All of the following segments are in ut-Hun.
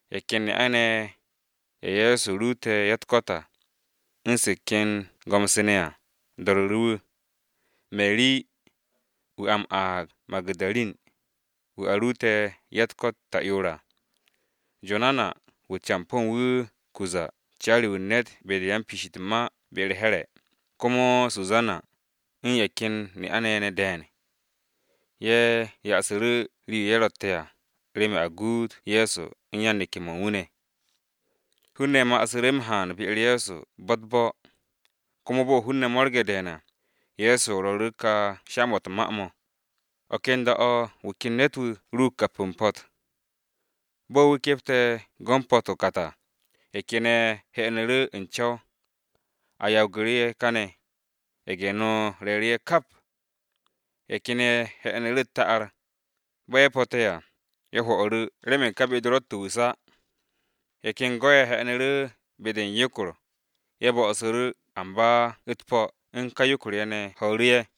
Ye̱ ken ne'a-ne̱ ye̱, ye̱ Ye̱so ruute̱ ya-u̱t-ko̱t à, u̱n se̱ ken go̱m-se ne̱ à, do̱ru̱ru̱ wu̱. Meri (wu̱ a m-aag Magu̱darin), wu̱ a ruute̱ ya-u̱t-ko̱t ta'yoor à. Jonana wu̱ campo̱ u̱n wu̱ Cuza caari-wu̱ u̱n ne̱t be-de u̱n piish u̱t-ma be-u̱r Here̱, komo Susana, u̱n ye̱ ken ne'a-ne̱ ye̱ ne̱ de̱e̱n. Ye̱ yasu̱ru̱ rii-yo ye̱ ro̱tte̱ à, remen a guut Ye̱so u̱n yan-neke̱-mo̱ u̱n wu̱ ne̱. Hun-ne̱ masu̱ru̱ m-haan be-u̱r Ye̱so bo̱-u̱t-bo̱, komo bo̱ hun-ne̱ mo̱rge̱ de̱e̱n à, Ye̱so rwo̱ru̱ru̱ ka sha-mo̱ u̱t-ma mo̱: “O̱ ken da-o̱ wu̱ ken ne̱t-wu̱ ruug kapu̱ u̱n po̱t. Bo̱ wu̱ kepte̱ go̱ u̱n po̱t o-kat à, ye̱ ken ye̱ he̱nu̱ru̱ u̱n co̱w, a yawgu̱ru̱ ye̱ kane̱, ye̱ge̱-no re̱e̱ru̱ ye̱ kap. Ye̱ ken ye̱ he̱nu̱ru̱ u̱t-ta'ar, bo̱ ye̱ po̱te̱ à, ye̱ hwo̱'u̱ru̱ remen ka be-de ro̱tt o-wu̱s á. Ye̱ ken go̱-ye̱ he̱nu̱ru̱ be-de u̱n yokor, ye̱ bo̱su̱ru̱ amba u̱t-po̱ u̱n ka yokor-ye̱ ne̱ ho̱o̱ru̱ ye̱.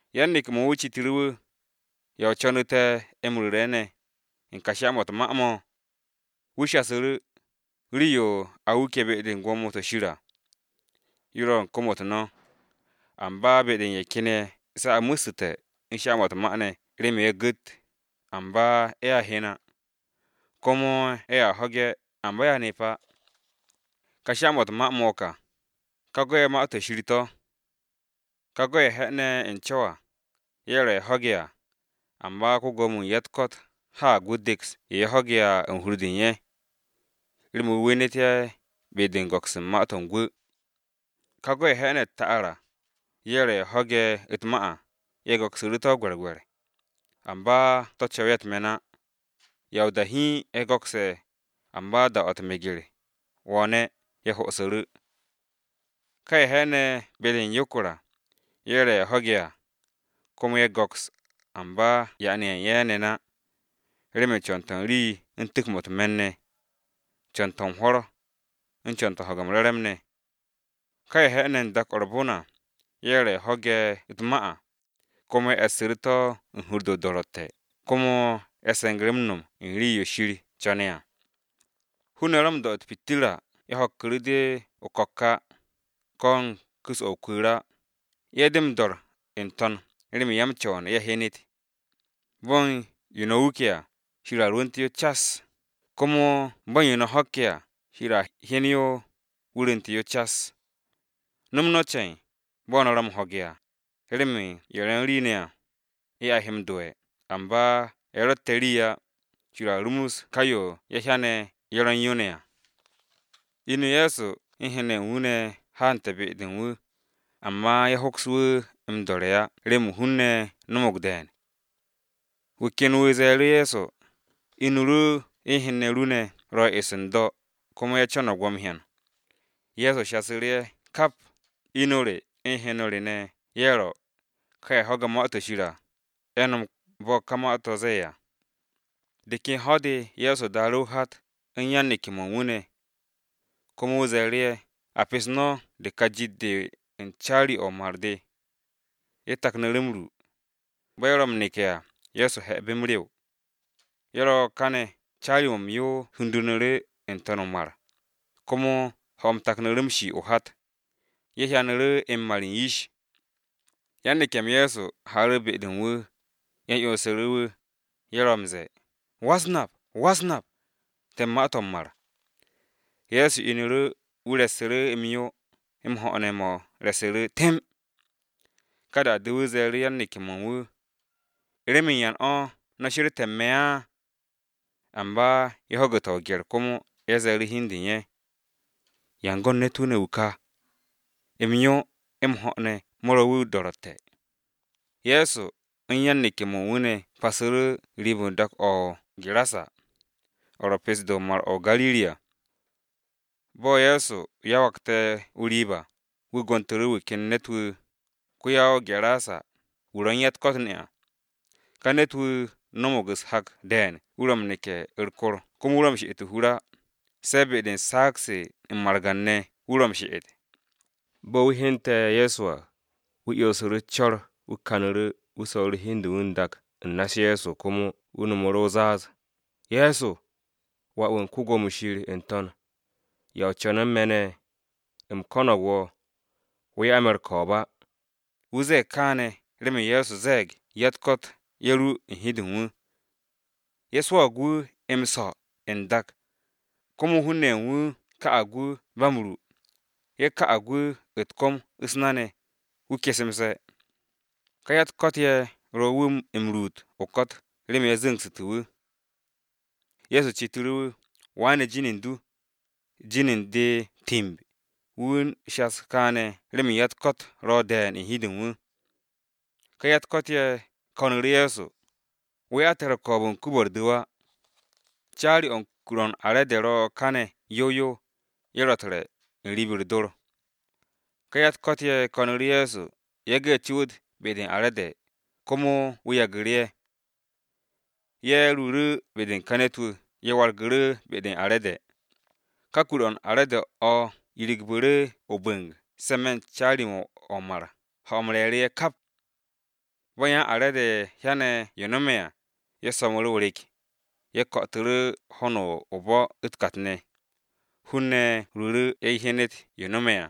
Yan-neke̱-mo̱ u̱n wu̱ citu̱ru̱ wu̱, “¿Ya o co̱nu̱ te̱ m-ru̱re̱ ne̱ u̱n ka sha-mo̱ u̱t-ma mo̱?” Wu̱ shasu̱ru̱, “Rii-yo a wuke̱ be-de u̱n gwo̱mo-to̱ Shir à, yo ro̱ u̱n kom-u̱t no̱, amba be-de u̱n ye̱ ken ye̱ se̱ a mo̱ssu̱te̱ u̱n sha-mo̱ u̱t-ma ne̱ remen ye̱a gu̱t, amba ye̱a hyen á, komo ye̱a ho̱ge̱ amba ye̱a nep á. “Ka sha-mo̱ u̱t-ma to̱ mo̱ ka: Ka go̱-ye̱ Ma-to̱ Shir to̱. Ka go̱-ye̱ he̱ne̱ u̱n co̱w à, ye̱ ro̱ ye̱ ho̱ge̱ à, amba ko-Gwo̱mo-wu̱ u̱n ya-u̱t-ko̱t haag wu̱ deks yo ye̱ ho̱ge̱ à u̱n hur-de u̱n ye̱, remen wu̱ wenet ye̱ be-de m-go̱ks u̱n ma-to̱ u̱n gwu̱. Ka go̱-ye̱ he̱ne̱ u̱t-ta'ar à, ye̱ ro̱ ye̱ ho̱ge̱ u̱t-ma à, ye̱ go̱ksu̱ru̱ gwe̱rgwe̱r. Amba to̱ co̱w ye̱ u̱t-me̱n á, ya o-da hiin ye̱ go̱kse̱, amba da-o̱ meger-u̱t wo̱o̱ne̱ à, ye̱ hosu̱ru̱. Ka ye̱ he̱ne̱ be-de u̱n yokor à, ye̱ ro̱ ye̱ ho̱ge̱ à, komo ye̱ go̱ks, amba yaane̱ ye̱ u̱n ye̱ ne̱n á, remen co̱n-to̱ u̱n rii u̱n tu̱k-mo̱ u̱t-me̱n ne̱, co̱n-to̱ u̱n hwo̱r, u̱n co̱n-to̱ u̱n ho̱ge̱ m-re̱re̱m ne̱. Ka ye̱ he̱ne̱ u̱n dak-o̱ u̱r-bon à, ye̱ ro̱ ye̱ ho̱ge̱ u̱t-ma à, komo ye̱ e̱ssu̱ru̱ to̱ u̱n hur-de o-do̱ro̱tte̱ komo ye̱ se̱ngu̱ru̱ m-no̱m u̱n rii-yo Shir co̱n ne̱ à. “Hun-ne̱ ro̱ m-do̱ u̱r-pitirra ye̱ ho̱kku̱ru̱ de o-ko̱k á. Ko̱ u̱n ku̱s-o̱ o-kwu̱u̱r á. Ye̱ de m-dor n-to̱n remen ya-m-co̱wo̱n ye̱ hyenet. “Bo̱ u̱n yo no̱ wuke̱ à, Shir a rwu̱nte̱ yo cas, komo bo̱ u̱n yo no̱ ho̱kke̱ à, Shir a hyen yo wu̱ rwu̱nte̱ yo cas. “No̱m no̱ ce̱e̱n, bo̱ no̱ ro̱ m-ho̱ge̱ à, remen ye̱ ro̱ u̱n rii ne̱ à, ye̱ a he m-do'e̱, amba ye̱ ro̱tte̱ rii á, Shir a rumus ka yo ye̱ hyane̱ ye̱ ro̱ u̱n yo ne̱ à.” Inu Ye̱so u̱n hen-ne̱ ye̱ u̱n wu̱ ne̱ haante̱ be-de u̱n wu̱, amba ye̱ hoks wu̱ m-do̱re̱ á remen hun-ne̱ no̱mo̱g de̱e̱n. Wu̱ ken wu̱ ze̱e̱ru̱ Ye̱so, “Inu ru u̱n hen-ne̱ ru ne̱ ro̱ eso n-do̱ komo ye̱ co̱no̱g wo̱ m-hyan.” Ye̱so ze̱e̱ru̱ ye̱ kap, “Inu re u̱n hen-ne̱ re ne̱ ye̱ ro̱, ka ye̱ ho̱ge̱ Ma-to̱ Shir à, ye̱ nom bo̱ ka ma-to̱ zee à.” De ken ho̱-de Ye̱so daaru̱ o-hat, u̱n yan-neke̱-mo̱ u̱n wu̱ ne̱. Komo wu̱ ze̱e̱ru̱ ye̱, “A pes no̱ de ka jit-de u̱n caari-o̱ o-mar de.” Ye̱ taknu̱ru̱ m-ru. Bo̱ ye̱ ro̱ m-neke̱ à, Ye̱so 'he̱bu̱ m-rew. Ye̱ ro̱ kane̱ caari-mo̱ m-yo hundu̱ru̱ n-to̱n o-mar, komo ho̱-m taknu̱ru̱ m-shi o-hat, ye̱ hyanu̱ru̱ m-mar u̱n yish. Yan-neke̱-m Ye̱so haaru̱ be-de u̱n wu̱, ye̱ 'yonsu̱ru̱ wu̱, ye̱ ro̱ m-ze̱e̱, “Go̱s-wu̱, Go̱s-wu̱! A ma-to̱ m-mar!” Ye̱so inu̱ru̱, wu̱ huru̱ m-yo u̱t-gaag, m-ho̱ ne̱ mo̱ re̱su̱ru̱ temb. Ka da-de wu̱ ze̱e̱ru̱ yan-neke̱-mo̱ u̱n wu̱, “¿Remen yan o̱ no̱ she̱rté̱ u̱n me̱ á?” Amba ye̱ ho̱gu̱te̱ o-gye̱r komo ye̱ ze̱e̱ru̱ hi u̱n de u̱n ye̱, “¿Yan go̱n ne̱t-wu̱ ne̱ wu̱ ka? M-yo, m-ho̱ ne̱ mo̱ ro̱ wu̱ o-do̱ro̱tte̱.” Ye̱so u̱n yan-neke̱-mo̱ u̱n wu̱ ne̱ pasu̱ru̱ riib-o dak-o̱ o-Garasa, o̱ ro̱ pesto-de Mar-o̱ o-Gariri à. Bo̱ Ye̱so yawagte̱ o-riib à, wu̱ gontu̱ru̱ wu̱ ken ne̱t-wu̱, ko-ya-o-Gedara, wu̱ ro̱ u̱n ya-u̱t-ko̱t ne̱ à. Ka ne̱t-wu̱ no̱mo̱g u̱s-hak de̱e̱n wu̱ ro̱ m-neke̱ u̱r-kor komo wu̱ ro̱ m-she'et o-hur á, se̱ be-de u̱n saag-se u̱n margan-ne̱ wu̱ ro̱ m-she'et. Bo̱ wu̱ hyente̱ Ye̱so à, wu̱ 'yonsu̱ru̱ u̱s-co̱r wu̱ kanu̱ru̱, wu̱ so̱ru̱ hi u̱n de u̱n wu̱ n-dak u̱n na-u̱s Ye̱so komo wu̱ no̱mu̱ru̱ o-zaaz, “Ye̱so, Wà-wu̱ u̱n Shir n-To̱n! ¿Ya o co̱ne̱ u̱n me̱ ne̱? U̱m ko̱no̱g wo̱, wo̱ 'ya me̱ u̱r-ko̱o̱b á!” Wu̱ ze̱e̱g kaane̱ remen Ye̱so ze̱e̱g ya-u̱t-ko̱t ye̱ ru u̱n hi-de u̱n wu̱. Ye̱ swo̱o̱g wu̱ m-so̱ n-dak, komo hun-ne̱ u̱n wu̱ ka'ag wu̱ ba m-ru, ye̱ ka'ag wu̱ u̱t-kom u̱s-na ne̱, wu̱ kesemse̱. Ka ya-u̱t-ko̱t ye̱ ro wu̱ m-ruut o-ko̱t remen ye̱ zu̱ngsu̱te̱ wu̱. Ye̱so citu̱ru̱ wu̱, “¿Waane̱ jin u̱n du?” “Jin u̱n de ‘Timb.’” Wu̱ u̱n shas kaane̱ remen ya-u̱t-ko̱t ro̱ de̱e̱n u̱n hi-de u̱n wu̱. Ka ya-u̱t-ko̱t ye̱ ko̱nu̱ru̱ Ye̱so, “Wo̱ 'ya te̱ u̱r-ko̱o̱b u̱n kuub-o̱ u̱r-du̱w á.” Caari-o̱ u̱n kur-o u̱n are̱de ro̱ kane̱ yow yow, ye̱ ro̱ u̱t-re̱ n-riib u̱r-dor. Ka ya-u̱t-ko̱t ye̱ ko̱nu̱ru̱ Ye̱so yage̱ ye̱ tu̱wu̱t be-de u̱n are̱de, komo wu̱ yagu̱ru̱ ye̱. Ye̱ ruuru̱ be-de u̱n ka ne̱t-wu̱, ye̱ wargu̱ru̱ be-de u̱n are̱de. Ka kur-o̱ u̱n are̱de o̱ yiru̱gbu̱ru̱ o-bu̱ng se̱ n-me̱ u̱n caari-o̱ o-mar ho̱-m re̱e̱ru̱ ye̱ kap. Bo̱ yan are̱de hyane̱ yo no̱me̱ à, ye̱ so̱mu̱ru̱ o-rek. Ye̱ ko̱'o̱tu̱ru̱ ho̱no o-bo̱ u̱t-kat ne̱. Hun-ne̱ ruuru̱ ye̱ hyenet yo no̱me̱ à,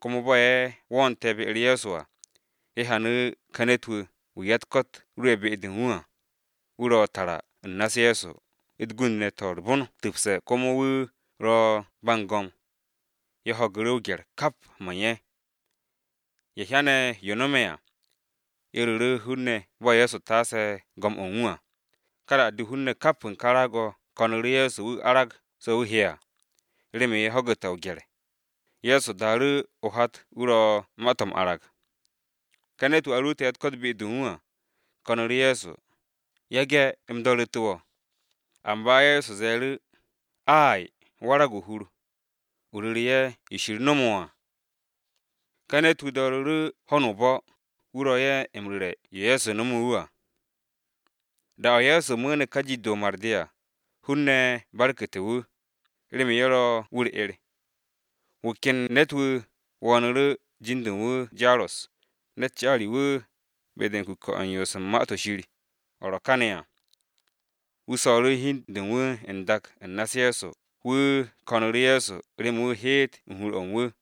komo bo̱ ye̱ wo̱'o̱nte̱ be-u̱r Ye̱so à, ye̱ hyanu̱ ka ne̱t-wu̱, wu̱ ya-u̱t-ko̱t ru'e̱ be-de u̱n wu̱ à, wu̱ ro̱ tara u̱n na-u̱s Ye̱so, u̱t-gund ne̱ to̱ u̱r-bon tu̱pse̱ komo wu̱ ro̱ ba u̱n go̱m, ye̱ ho̱gu̱ru̱ o-gye̱r kap mo̱ u̱n ye̱. Ye̱ hyane̱ yo nome̱ à, ye̱ ru̱ru̱ hun-ne̱ bo̱ Ye̱so taase go̱m u̱n wu̱ à. Ka da-de hun-ne̱ kap u̱n ka raag-o̱ ko̱nu̱ru̱ Ye̱so wu̱ arag so̱ wu̱ he'e̱ à, remen ye̱ ho̱gu̱te̱ o-gye̱r. Ye̱so daaru̱ o-hat wu̱ ro̱ ma-to̱ m-arag. Ka ne̱t-wu̱ a ruute̱ ya-u̱t-ko̱t be-de u̱n wu̱ à, ko̱nu̱ru̱ Ye̱so, “Yage̱ u̱m do̱ru̱te̱ wo̱.” Amba Ye̱so ze̱e̱ru̱, “Ay, warag o-hur, o ru̱re̱ ye̱ yo Shir nomo wo̱ à.” Ka ne̱t-wu̱ do̱ru̱ru̱ ho̱no o-bo̱, wu̱ ro̱ ye̱ m-ru̱re̱ yo Ye̱so nome̱ wu̱ à. Da-o̱ Ye̱so mu̱u̱ne̱ de ka jit-de o-mar de à, hun-ne̱ barku̱te̱ wu̱, remen ye̱ ro̱ wu̱ u̱r-'er. Wu̱ ken ne̱t-wu̱ wo̱o̱nu̱ru̱, jin-de u̱n wu̱ Jaros, ne̱t wan-co u̱n kuke̱-o̱ u̱n yoos u̱n Ma-to̱ Shir, o̱ ro̱ kane̱ à. Wu̱ so̱ru̱ hi u̱n de u̱n wu̱ n-dak u̱n na-u̱s Ye̱so wu̱ ko̱nu̱ru̱ Ye̱so remen wu̱ heet u̱n hur-o̱ u̱n wu̱.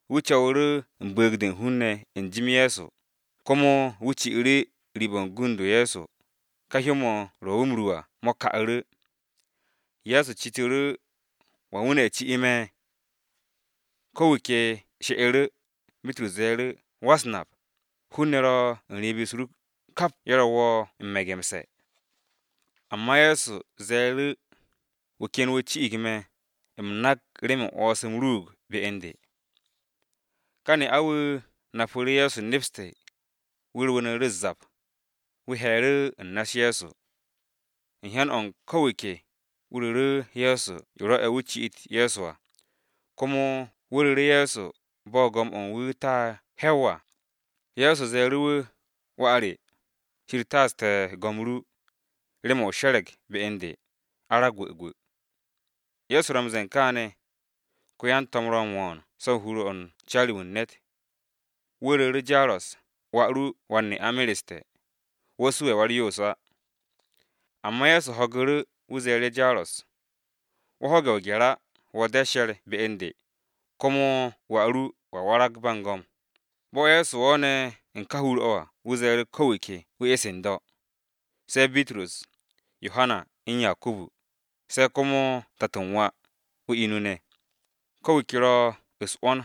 Wu̱ co̱wu̱ru̱ u̱n bu̱u̱g-de u̱n hun-ne̱ n-jim Ye̱so, komo wu̱ ci'u̱ru̱ riib-o̱ u̱n gund-o Ye̱so, ka hyó-mo̱ ro wu̱ m-ru à mo̱ ka'u̱ru̱. Ye̱so citu̱ru̱, “¿Wan wu̱ ne̱ ci me̱?” Ko̱ wu̱ ke she'u̱ru̱, Bitrus ze̱e̱ru̱, “Go̱s-wu̱, hun-ne̱ ro̱ u̱n riib-u̱s ru kap ye̱ ro̱ wo̱ m-me̱gemse̱.” Amba Ye̱so ze̱e̱ru̱, “Wu̱ ken wu̱ ci'ig me̱, u̱m nak remen 'wo̱ns-m ruug be u̱n de.” Ka ne'a-wu̱ napu̱ru̱ Ye̱so nepste̱, wu̱ rwu̱u̱nu̱ru̱ u̱s-zap, wu̱ he̱e̱ru̱ u̱n na-u̱s Ye̱so. U̱n hyan-o̱ u̱n ko̱ wu̱ ke, wu̱ ru̱ru̱ Ye̱so yo rwo̱'e̱ wu̱ ci'it Ye̱so à, komo wu̱ ru̱ru̱ Ye̱so bo̱ go̱m-o̱ u̱n wu̱ ta hwe̱w à. Ye̱so ze̱e̱ru̱ wu̱, “Wà re, Shir taaste̱ go̱m ru, remen o she̱re̱g be u̱n de. Arag gwu̱gwu̱.” Ye̱so ro̱ m-ze̱e̱ u̱n kaane̱, ko-yan-to̱m ro̱ m-wo̱o̱n so̱ u̱n hur-o̱ u̱n wan-co u̱n kuke̱-o̱ u̱n yoos u̱n Ma-to̱ Shir. Wu̱ ru̱ru̱ Jaros, “Wà ru wan-ne'a mereste̱, wo̱ su'e̱ Wa-u̱r-Yoos á.” Amba Ye̱so ho̱gu̱ru̱ wu̱ ze̱e̱ru̱ Jaros, “Wo̱ ho̱ge̱ o-gye̱r á, wo̱ de she̱r be u̱n de, komo wà ru wu̱a warag ba u̱n go̱m.” Bo̱ Ye̱so wo̱o̱ne̱ u̱n ka hur-o̱ à, wu̱ ze̱e̱ru̱ ko̱ wu̱ ke wu̱ e̱s n-do̱, se̱ Bitrus, Yohana u̱n Yakubu, se̱ komo tato u̱n wà, o-inu ne̱. Ko̱ wu̱ ke ro̱ u̱s-'wo̱n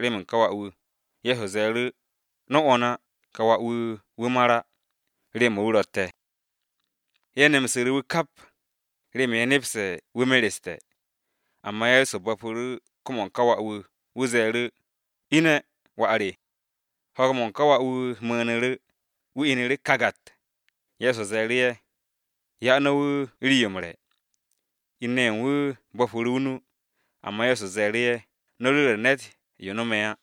remen ka wà-wu̱. Ye̱so ze̱e̱ru̱, “No̱ 'wo̱n á, ka wà-wu̱, wu̱ mar á, rew-mo̱ wu̱ ro̱tte̱!” Ye̱ nemsu̱ru̱ wu̱ kap, remen ye̱ nepse̱ wu̱ mereste̱. Amba Ye̱so bo̱pu̱ru̱ kom-o̱ u̱n ka wà-wu̱, wu̱ ze̱e̱ru̱, “Ine̱, wà re!” Ho̱o̱g-mo̱ u̱n ka wà-wu̱ mu̱u̱nu̱ru̱, wu̱ inu̱ru̱ kagat. Ye̱so ze̱e̱ru̱ ye̱, “Ya no̱ wu̱ rii-yo m-re̱.” In-ne̱ ye̱ u̱n wu̱ bo̱pu̱ru̱ o-nu, amba Ye̱so ze̱e̱ru̱ ye̱, “No̱ ru̱re̱ ne̱t yo no̱me̱ á.”